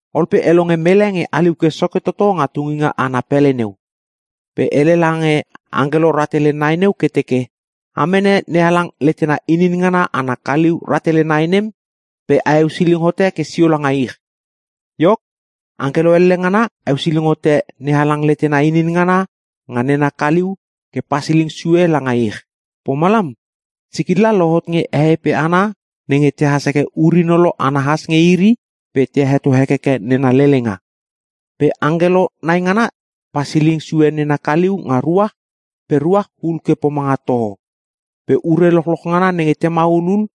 Ol pe e longe mele nge haliu ke soke toto nga tunginga ana pele neu. Pe hele lange angkelo rahtele nai neu ke teke, “A mene NeHalang letena inin ngana ana kaliu rahtele nai nem pe a eusiling hote ke sio langa ich.” Iok, angkelo elle ngana eusiling hote NeHalang letena inin ngana nga nena kaliu ke pasiling sue ke langa ich. Pomalam sikilla lohot nge hehei pe hana nenge tehas heke ur-inolo ana has nge iri pe te heto hekeke nena lelenga. Pe angkelo nai ngana pasiling sue nena kaliu nga ruach pe ruach hul ke pomanga toho. Pe ure lochloch ngana nenge te maulul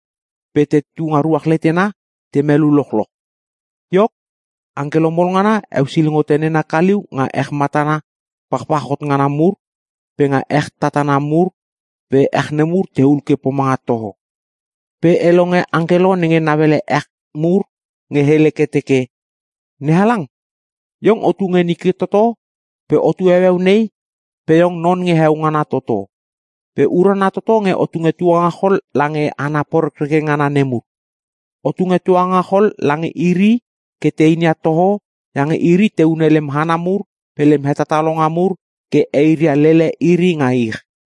pe tetu nga ruach letena te melu lochloch. Iok, angkelo mol ngana eusiling hote nena kaliu nga ech matana pachpach hot ngana mur pe nga ech tatana mur pe ech nemur tehul ke pomanga toho. Ol pe e longe angkelo nenge nauele ech mur nge hele ke teke, “NeHalang, Iong otu nge nike toto pe otu heueu nei pe Iong non nge Heo Ngana toto. Pe urana toto nge o tunge tuangachol lange hana porekreke ngana nemur. O tunge tuangachol lange iri ke te inia toho iange iri te hune lem hana mur pe lem hetatalonga mur ke eiria lele iri nga ich!”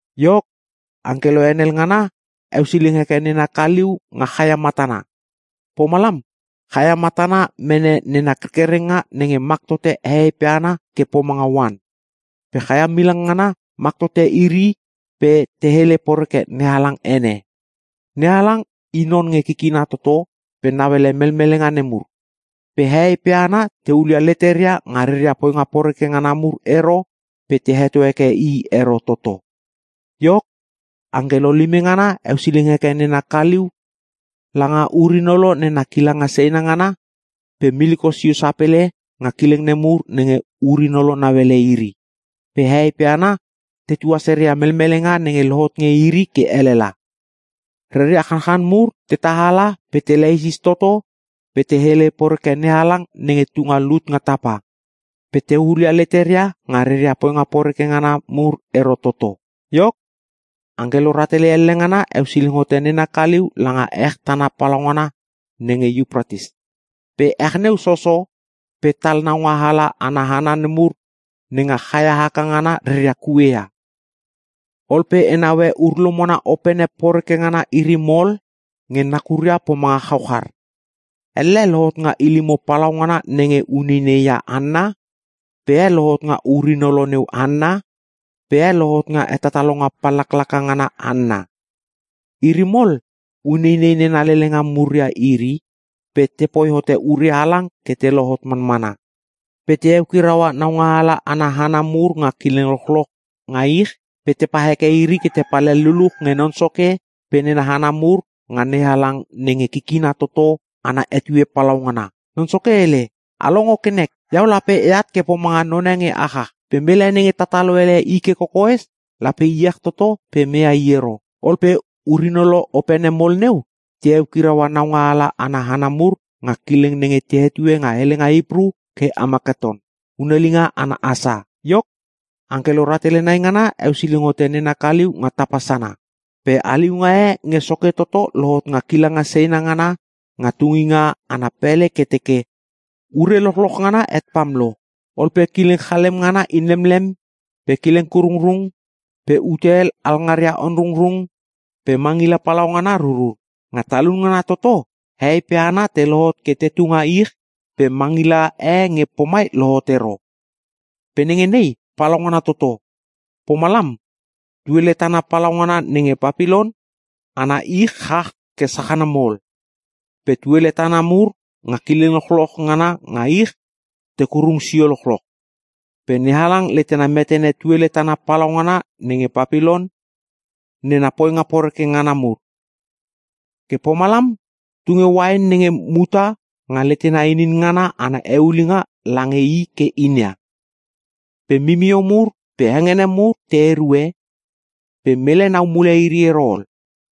Iok, angkelo henel ngana eusiling heke nena kaliu nga chaia matana. Pomalam chaia matana mene nena kerkerenga nenge mak tote hehei pe hana ke pomanga oan. Pe chaia milang ngana mak tote iri pe te hele poreke NeHalang ene. NeHalang I non nge kikina toto pe nauele melmelenga nemur. Pe hehei pe hana te hulia leteria nga reria poinga poreke ngana mur ero pe te heto heke I ero toto. Iok, angkelo lime ngana eusiling heke nena kaliu langa ur-hinolo nena kilanga seina ngana, pe miliko sio sapele nga kileng nemur nenge ur-inolo nauele iri. Pe hehei pe hana tetua sereia melmelenga nenge lohot nge iri ke elela. Reria chanchan mur te tahala pe te leisis toto pe te hele poreke NeHalang nenge tunga lut nga tapa. Pe te hulia leteria nga reria poinga poreke ngana mur ero toto. Iok, angkelo rahtele elle ngana eusiling hote nena kaliu langa ech tana palaungana nenge Iupratis, pe ech neu soso pe tal naungaala ana hana nemur, nga chaia haka ngana reria kue ia. Ol pe e naue ur-lomona opene poreke ngana iri mol nge nakuria pomanga chauchar. Elle lohot nga ilimo palaungana nenge uneinei ia hanna, pe e lohot nga ur-inolo neu hanna, pe e lohot nga hetatalonga pallaklaka ngana hanna. Iri mol uneinei nena lelenga mur ia iri pe tepoi hote ure halang ke te lohot manmana. Pe te eukiraua naungaala ana hana mur nga kileng lochloch nga ich pe tepa heke iri ke te palhel luluch nge Non Soke pe nena hana mur nga NeHalang nenge Kikina toto ana etue palaungana. (Non Soke hele, “A longo ke nek! Iau lape eat ke pomanga none nenge achach! Pe mele nenge tatalo ele i ke kokoes lape iech toto pe meia i ero!”) Ol pe ur-inolo opene mol neu te eukiraua naungaala ana hana mur nga kileng nenge te hetue nga helenga Hipru ke Amaketon. (Hunelinga ana hasa) Iok, angkelo rahtele nai ngana eusiling hote nena kaliu nga tapa sana. Pe haliunga e nge soke toto lohot nga kilanga seina ngana nga tunginga ana pele ke teke, “Ure lochloch ngana het pam lo!” Ol pe kileng chalem ngana inlemlem, pe kileng kurungrung, pe ute hel alngaria onrungrung, pe mangila palaungana rurur. Nga talun ngana toto hehei pe hana te lohot ke tetu nga ich pe mangila e nge pomai lohot ero. Pe nenge nei palaungana toto. Pomalam, tuele tana palaungana nenge Papilon ana ich chach ke sachana mol. Pe tuele tatana mur nga kileng lochloch ngana nga ich te kurung sio lochloch. Pe NeHalang letena metene tuele tana palaungana nenge Papilon nena poinga poreke ngana mur. Ke pomalam tunge uain nenge muta nga letena inin ngana ana eulinga lange i ke inia. Pe mimio mur pe hengene mur te erue, pe mele nau mule iri ero ol.